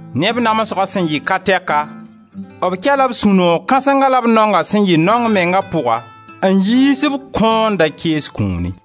Ne b namsga sẽn yɩ ka tɛka, b kɛ-la b sũ-noog kãsenga la b naonga sẽn yɩ naong menga pʋga n yiis b kõo-n-da-kees kũuni.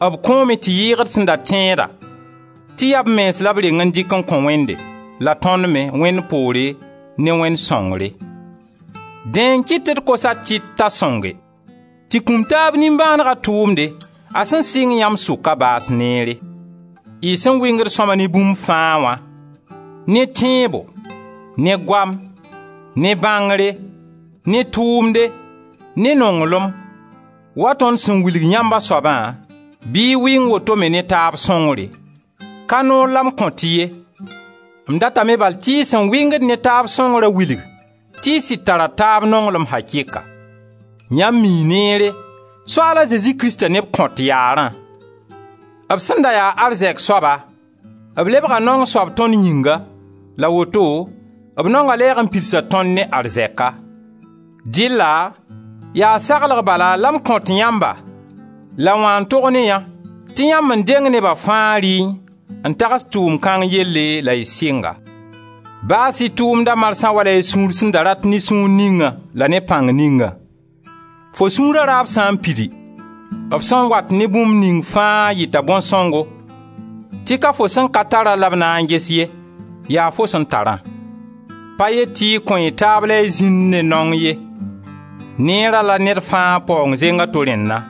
B kõome tɩ yɩɩg d sẽn da tẽeda tɩ yaa b mens la b reng n dɩk n kõ Wẽnde, la tõnd me, Wẽnd poore, ne Wẽnd sõngre. Dẽ n kɩt tɩ d kos a Tit t'a sõnge, tɩ kũm-taab-nimbãanega tʋʋmde a sẽn sɩng yãmb sʋka, baas neere. Y sẽn wɩngd sõma ne bũmb faa wã: ne tẽebo, ne goam, ne bãngre, ne tʋʋmde, ne nonglem, wa tõnd sẽn wilg yãmb a soabã, bɩ y wɩng woto me ne taab sõngre. Ka noor la m kõt-y ye, m datame bal tɩ y sẽn wɩngd ne taab sõngrã wilg tɩ y sɩd tara taab nonglem akɩka. Yãmb mii neere Soaal a Zezi Krista ne b kõt yaarã. B sẽn da ya arzɛk soaba b lebga naong soab tõnd yĩnga la woto b naonga lɛɛg n pidsa tõnd ne arzɛka. Dɩlla yaa saglg bala la m kõt yãmba la wã n tog ne yã tɩ yãmb n deng neba fãa rɩẽ, n tags tʋʋmd kãng yelle la y sɩng-a. Baas-y tʋʋmda marsã wala y sẽn da rat ne sũur ningã la ne pãng ningã. Fo sũura raab sã n pidi, f sẽn wat ne bũmb ning fãa yɩta bõn-sõngo tɩ ka fo sẽn ka tara la b na n ges ye, yaa fo sẽn tarã. Pa yet tɩ y kõ y taab la y zĩnd ne naong ye; neera la ned fãa paoong zeng a to rẽnna.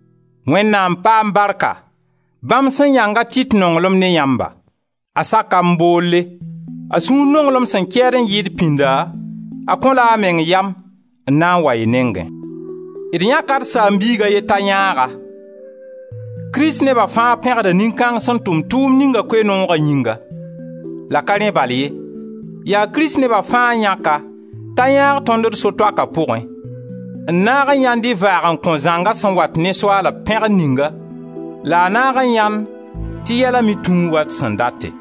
Wẽnnaam paam barka, bãmb sẽn yãnga a Tit nonglem ne yãmba! A saka m boolle. A sũura nonglem sẽn kɛɛd n yɩɩd pĩnda, a kõ-la a meng yam n na n wa y nengẽ. D yãka d saam-biig a ye t'a yãag-a; kristneba fãa pẽgda nin-kãng sẽn tʋm tʋʋmd ninga Koe-nooga yĩnga; la ka rẽ bal ye, yaa kristneba fãa n yãk-a t'a yãag tõnd d so-toaka pʋgẽ, n naag n yãend y vaag-n-kõ zãnga sẽn wat ne Soaala pẽgr ninga la a naag n yãend tɩ yɛla me tũu wa d sẽn date.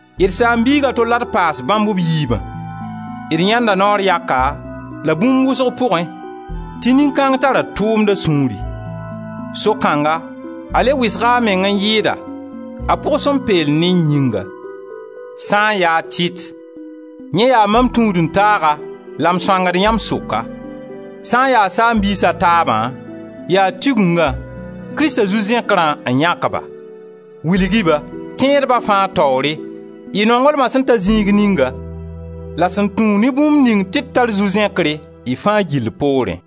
D saam-biig a to la d paas bãmb b yiibã; d yãenda naoor yaka la bũmb wʋsg pʋgẽ tɩ nin-kãng tara tʋʋmda sũuri; so kãngã, a le wɩsg a meng n yɩɩda, a pʋg sẽn peel ne-y yĩnga. Sã n ya a Tit, yẽ yaa mam tũud-n-taaga la m sõangd yãmb sʋka; sã n ya saam-biis a taabã, yaa Tigengã, Krista zu-zẽkrã, n yãk-ba. Wilg-y-ba, tẽedba fãa taoore, y nonglma sẽn ta zĩig ninga la sẽn tũ ne bũmb ning tɩ d tar zu-zẽkre y fãa gill poorẽ.